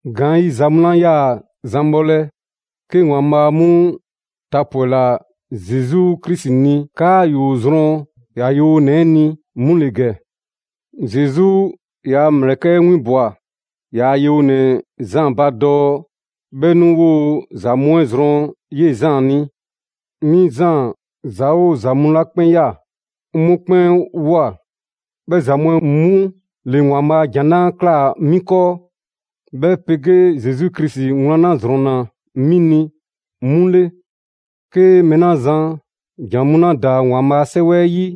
Gaanyiza mu 'la 'yaa‑ zan bhɔlɛ, 'ke Waanbhaa' 'mu tapwɛla Zesu Krisi ni 'kaa ‑yoo zrɔn ‑yaa' yewonɛ 'ɛ ni 'mu ‑le ‑gɛ. Zesu ‑yaa' ‑mlɛkɛ' 'ɛ winbwa‑ ‑yaa' yewonɛ Zaan ba dɔɔ 'bhɛ 'nu 'woo‑ ‑za mu 'ɛ zrɔn 'yee‑ Zaan ni. 'Mi Zaan ‑za 'oo ‑za mu 'la 'kpɛn ꞊ya, 'ŋ 'mu 'kpɛn ꞊woa. 'Bhɛ ‑za mu 'ɛ 'mu ‑le ‑Waanbhaa' ‑jan 'la ꞊klaa 'mi 'kɔɔ, 'bhɛ 'pegee Zesu Krisi wlan 'la ‑zrɔnna 'mi ni, 'mu 'le. 'Ke mɛɛ 'la zan ‑jan mu 'la ‑daa ‑Waanbhaa a 'Sɛwɛ 'ɛ 'yi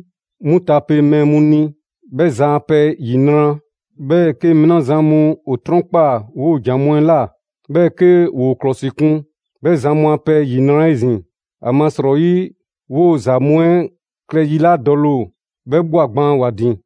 'mu tape mɛɛ mu ni, 'bhɛ zan a pɛ ‑yinra'! 'Bhɛɛ‑ 'ke mɛɛ 'la zan mu ‑o 'trɔnkpaa‑ 'woo‑ ‑jan mu 'ɛ ꞊la, 'bhɛɛ‑ 'ke ‑woo ‑klɔsikwan, 'bhɛ zan mu a pɛ ‑yinra' 'ezin‑! ‑Amasrɔyi 'woo‑ ‑za mu 'ɛ klɛ yi 'la dɔle ‑o, 'bhɛ ꞊bhwa gban ‑wa ‑din.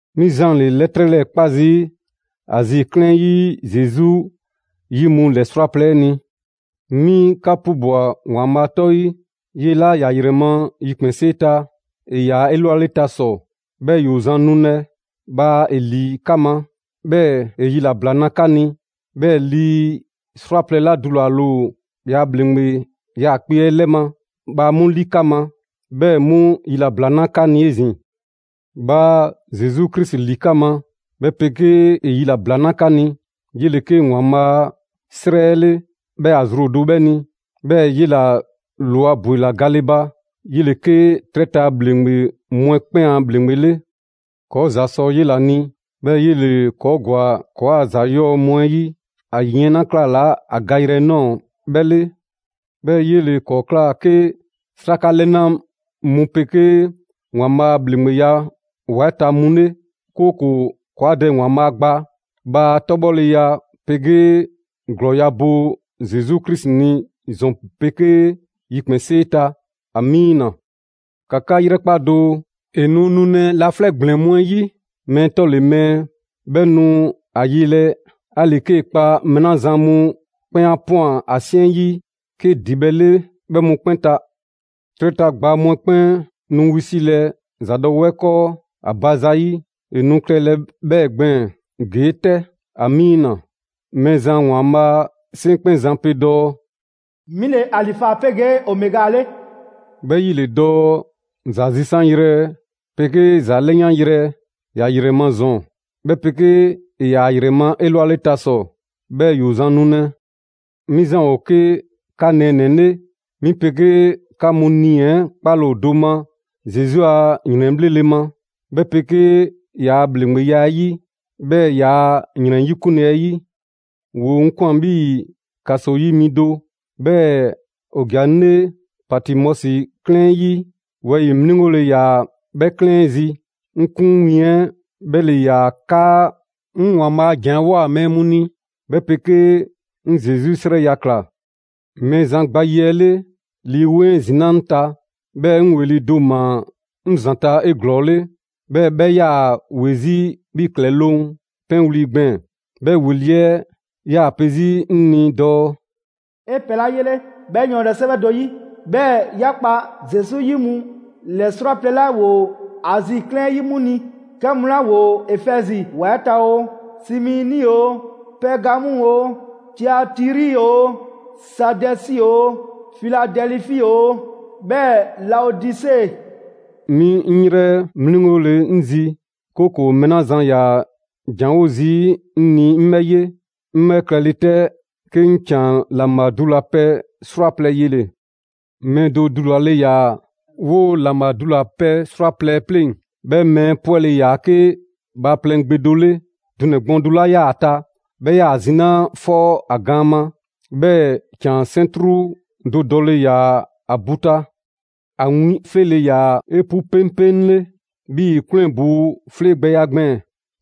'Mi Zaan ‑le 'lɛtrɛ 'lɛɛ‑ 'kpa zii' Azi 'klɛɛn 'ɛ 'yi Zesu 'yi mu ‑lɛ 'srwaplɛ‑ 'ɛ ni. 'Mi 'ka 'pubwa‑ ‑Waanbhaa' 'tɔ 'yi; 'yee‑ 'la ‑ya ‑yrɛ ma yikpɛnsee ta, ‑e ‑yaa 'elwaleta ‑sɔ, 'bhɛɛ‑ ‑yoo zan nulɛ, bhaa ‑e ‑li 'ka ma, 'bhɛɛ‑ ‑e yilabla 'na 'ka ni! 'Bhɛɛ‑ lii 'srwaplɛ‑ 'la dulale ‑o ‑yaa' ‑bhleŋgbe 'yaakpe‑ 'ɛ 'lɛ ma, bhaa 'mu 'li 'ka ma, 'bhɛɛ‑ 'mu yilabla na 'ka ni 'ezin‑. Bhaa Zesu Krisi ‑li 'ka ma, 'bhɛ 'pegee ‑e yilabla 'na 'ka ni. 'Yele‑ 'ke ‑Waanbhaa' 'srɛ 'ɛ 'le, 'bhɛɛ‑ ‑a zru ‑o do 'bhɛ ni; 'bhɛɛ‑ 'yela‑ ‑lwa ‑bwela gale ba. 'Yele‑ 'ke 'trɛ ta ‑bhleŋgbe mu 'ɛ 'kpɛn a ‑Bhleŋgbe 'le. ‑Kɔɔ' ‑za sɔ 'yela‑ ni, 'bhɛɛ‑ 'yele‑ ‑kɔɔ' ‑gwa ‑kɔɔa' ‑za 'yɔɔ‑ mu 'ɛ 'yi a yiɛn 'la 'klalaa‑ a gayrɛ 'ɛ ꞊nɔɔ 'bhɛ 'le. 'Bhɛɛ‑ 'yele‑ ‑kɔɔ' ꞊kla 'ke 'sraka 'lɛna mu 'pegee ‑Waanbhaa' a ‑bhleŋgbeya ‑wa 'ɛ ta mu 'le; 'kooko‑ ‑kɔɔa' Dɛ ‑Waanbhaa' gba. Bhaa 'tɔbhɔleya 'pegee ‑glɔɔya' bo Zesu Krisi ni ‑zɔn 'pegee yikpɛnsee ta! Amiina! ‑Ka 'ka 'yrɛkpa doo, ‑e nu nulɛ laflɛ' ‑gblɛn mu 'ɛ 'yi! Mɛɛ 'tɔle‑ mɛɛ 'bhɛ nu ‑a yelɛ, 'ali‑ 'kee‑ kpa mɛɛ 'la zan mu 'kpɛn 'a ꞊pwan ‑a 'siɛn 'yi 'ke ‑dibhɛ' 'le bhe 'mu 'kpɛn ta. 'Trɛ ta ‑gbaa mu 'ɛ 'kpɛn nu wisilɛ ‑zadɔwɛɛ 'kɔɔ ‑a ba ‑zayi'. ‑E nu klɛlɛ 'bhɛɛ‑ gbɛɛn‑ ‑gee' 'tɛ! Mɛɛzan ‑Waanbhaa' 'Seŋkpɛnzan pe dɔɔ: «'Mi ‑le Alifa 'pegee Omega 'le», 'bhɛ 'yi ‑le dɔɔ ‹‑za zisanyrɛ, 'pegee ‑za 'lɛyanyrɛ›. ‑Ya ‑yrɛ ma ‑zɔn, 'bhɛ 'pegee ‑e ‑yaa ‑a ‑yrɛ ma 'elwaleta ‑sɔ, 'bhɛɛ‑ ‑yoo zan nulɛ! 'Mi Zaan ‑o 'ke 'ka nɛɛnɛ‑ 'le. 'Mi 'pegee 'ka mu nii‑ 'ɛ 'kpale‑ ‑o do ma Zesu a ‑yrɛnbhlele ma, 'bhɛ 'pegee ‑yaa' ‑bhleŋgbeya 'ɛ 'yi, 'bhɛɛ‑ ‑yaa' ‑yrɛn 'yikunle 'ɛ 'yi. ‑Woo 'ŋ ꞊kwan 'bhii‑ ‑kaso 'yi mi do, 'bhɛɛ‑ ‑o ‑ja 'ŋ 'le Patimɔsi 'klɛɛn 'ɛ 'yi: wɛyi‑ 'mliŋgole ‑yaa 'bhɛ 'klɛɛn 'ɛ zi. 'Ŋ 'kun win 'ɛ 'bhɛ ‑le ‑yaa 'kaa 'ŋ ‑Waanbhaa' a ‑jan 'ɛ꞊woa mɛɛ mu ni, 'bhɛ 'pegee 'ŋ Zesu 'srɛya‑ ꞊kla. Mɛɛzan gba yi 'ɛ 'le, Lii 'Weŋ 'ɛ ‑zinaa' 'ŋ ta, 'bhɛɛ‑ 'ŋ ‑weli' do ‑maa 'ŋ ‑zanta' 'eglɔɔle, 'bhɛɛ‑ 'bhɛ 'yaa‑ ‑we zii' 'bhii‑ ‑klɛloŋ' 'pɛnwli‑ gbɛɛn‑. 'Bhɛ ‑weli' 'ɛ 'yaa‑ pe 'zi 'ŋ ni dɔɔ: «'E pɛ 'la 'yele‑ 'bhɛ yɔɔndɛ 'sɛwɛ do 'yi, 'bhɛɛ‑ ‑ya kpa Zesu 'yi mu ‑lɛ 'srwaplɛ‑ 'la ‑woo Azi 'klɛɛn 'ɛ 'yi 'mu ni: 'kɛ mu 'la ‑woo Efɛzi ‑wa 'ɛ ta oo, Simiini oo, Pɛɛgamu oo, Tiatiri oo, Saadɛsi oo, Filadɛlifi oo, 'bhɛɛ‑ Laodise.» 'Mi 'ŋ 'yrɛ 'mliŋgole 'ŋ zi, 'kooko‑ mɛɛ 'la zan ‑yaa ‑janwo' zii' 'ŋ ni 'ŋ 'bhɛ 'ye. 'Ŋ 'bhɛ klɛle 'tɛ, 'ke 'ŋ ‑can ‑laŋbha dulapɛ 'srwaplɛ‑ yele‑. Mɛɛ do dulale ‑yaa 'woo‑ ‑laŋbha dulapɛ 'srwaplɛ‑ 'ɛ pleŋ‑; 'bhɛ mɛɛ 'ɛ 'pwɛle‑ ‑yaa 'ke bhaaplɛŋ gbe do 'le. Dunɛ‑ gbɔɔn do 'la 'yaa‑ ‑a ta 'bhɛ 'yaa‑ zinaa' 'fɔ ‑a gaan ma, 'bhɛɛ‑ ‑can 'sɛntru do dɔle ‑yaa ‑a ‑bu ta. ‑A win 'fleele‑ ‑yaa 'epu 'peŋpeŋle 'bhii‑ 'kwlɛn‑ ‑buu' 'flee gbɛya gbɛɛn‑.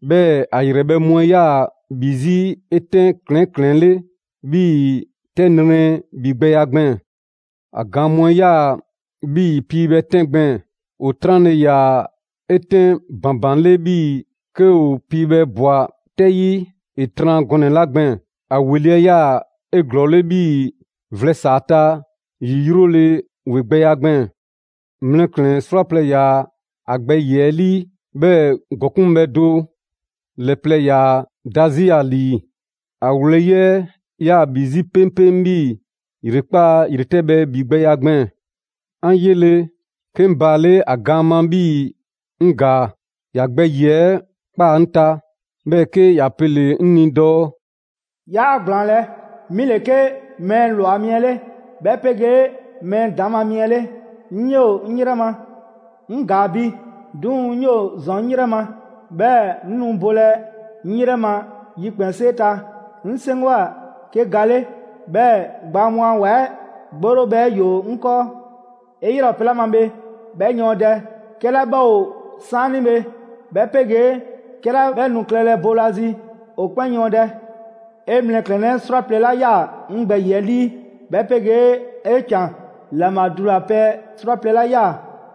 'Bhɛɛ‑ ‑a ‑yrɛbhɛ' mu 'ɛ 'yaa‑ ‑bhi 'zi 'etɛn ‑klɛɛn' ‑klɛɛnle' 'bhii‑ 'tɛ nrɛ ‑bhigbɛya gbɛɛn‑. ‑A gaan mu 'ɛ 'yaa‑ 'bhii‑ piibhɛ 'tɛn gbɛɛn‑: ‑o 'tranle‑ ‑yaa 'etɛn ‑banbanle 'bhii‑ 'ke ‑o piibhɛ ꞊bwa 'tɛ 'yi ‑e tran gɔnɛ‑ 'la gbɛɛn‑. ‑A ‑weli' 'ɛ 'yaa‑ 'eglɔɔle 'bhii‑ vlɛ ‑saa ta ‑yi 'yrole‑ ‑wegbɛya gbɛɛn‑. Mlɛklɛn‑ 'srwaplɛ‑ ‑yaa ‑a gbɛ ‑yiɛ' 'ɛ ‑lii, 'bhɛɛ‑ ‑gɔkuŋbhɛ do ‑lɛ plɛ 'yaa‑ da 'zi ‑a ‑lii. ‑A wlɛyi' 'ɛ 'yaa‑ ‑bhi 'zi 'peŋpeŋ 'bhii‑ ‑yrekpaa' ‑yretɛbhɛ ‑bhigbɛya gbɛɛn‑. 'An 'yele‑, 'ke 'ŋ baale' ‑a gaan ma 'bhii‑ 'ŋ ‑gaa. ‑Ya gbɛ ‑yiɛ' 'ɛ ꞊kpaa 'ŋ ta, 'bhɛɛ‑ 'ke ‑ya pele‑ 'ŋ ni dɔɔ: «'Yaa ‑gblaanlɛ', 'mi ‑le 'ke mɛɛ ‑lwa mi 'ɛ 'le, 'bhɛ 'pegee mɛɛ ‑daŋ' ma mi 'ɛ 'le. 'Ŋ 'yoo‑ 'ŋ 'yrɛ ma. 'Ŋ ‑gaa bi, 'duŋ‑ 'ŋ 'yoo‑ ‑zɔn 'ŋ 'yrɛ ma, 'bhɛɛ‑ 'ŋ nu bolɛ 'ŋ 'yrɛ ma yikpɛnsee ta. 'Ŋ 'seŋgwa‑ 'ke ga 'le, 'bhɛɛ‑ gbaa mu a ‑wa 'ɛ 'gborobhɛ 'ɛ ‑yoo 'ŋ 'kɔɔ. 'E 'yrɛ ‑o pɛ 'la ma bhe, 'bhɛ yɔɔndɛ: 'kɛla 'bhɛ ‑o 'saanibhe, 'bhɛ 'pegee 'kɛla 'bhɛ nu klɛlɛ boolazi, ‑o 'kpɛn yɔɔndɛ. 'E mlɛklɛnnɛ 'srwaplɛ‑ 'la ꞊ya 'ŋ gbɛ ‑yiɛ' 'ɛ 'lii, 'bhɛ 'pegee 'e ‑can ‑laŋbha dulapɛ 'srwaplɛ‑ 'la ꞊ya,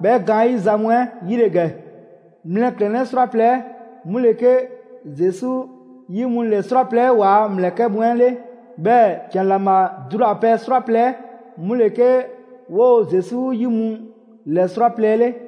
'bhɛ gaanyiza mu 'ɛ 'yi ‑le ‑gɛ: mlɛklɛnnɛ 'srwaplɛ‑ 'ɛ 'mu ‑le 'ke Zesu 'yi mu ‑lɛ 'srwaplɛ‑ 'ɛ ‑waa' ‑mlɛkɛ' mu 'ɛ 'le. 'Bhɛɛ‑ ‑can ‑laŋbha dulapɛ 'srwaplɛ‑ 'ɛ 'mu ‑le 'ke 'woo‑ Zesu 'yi mu ‑lɛ 'srwaplɛ‑ 'ɛ 'le.»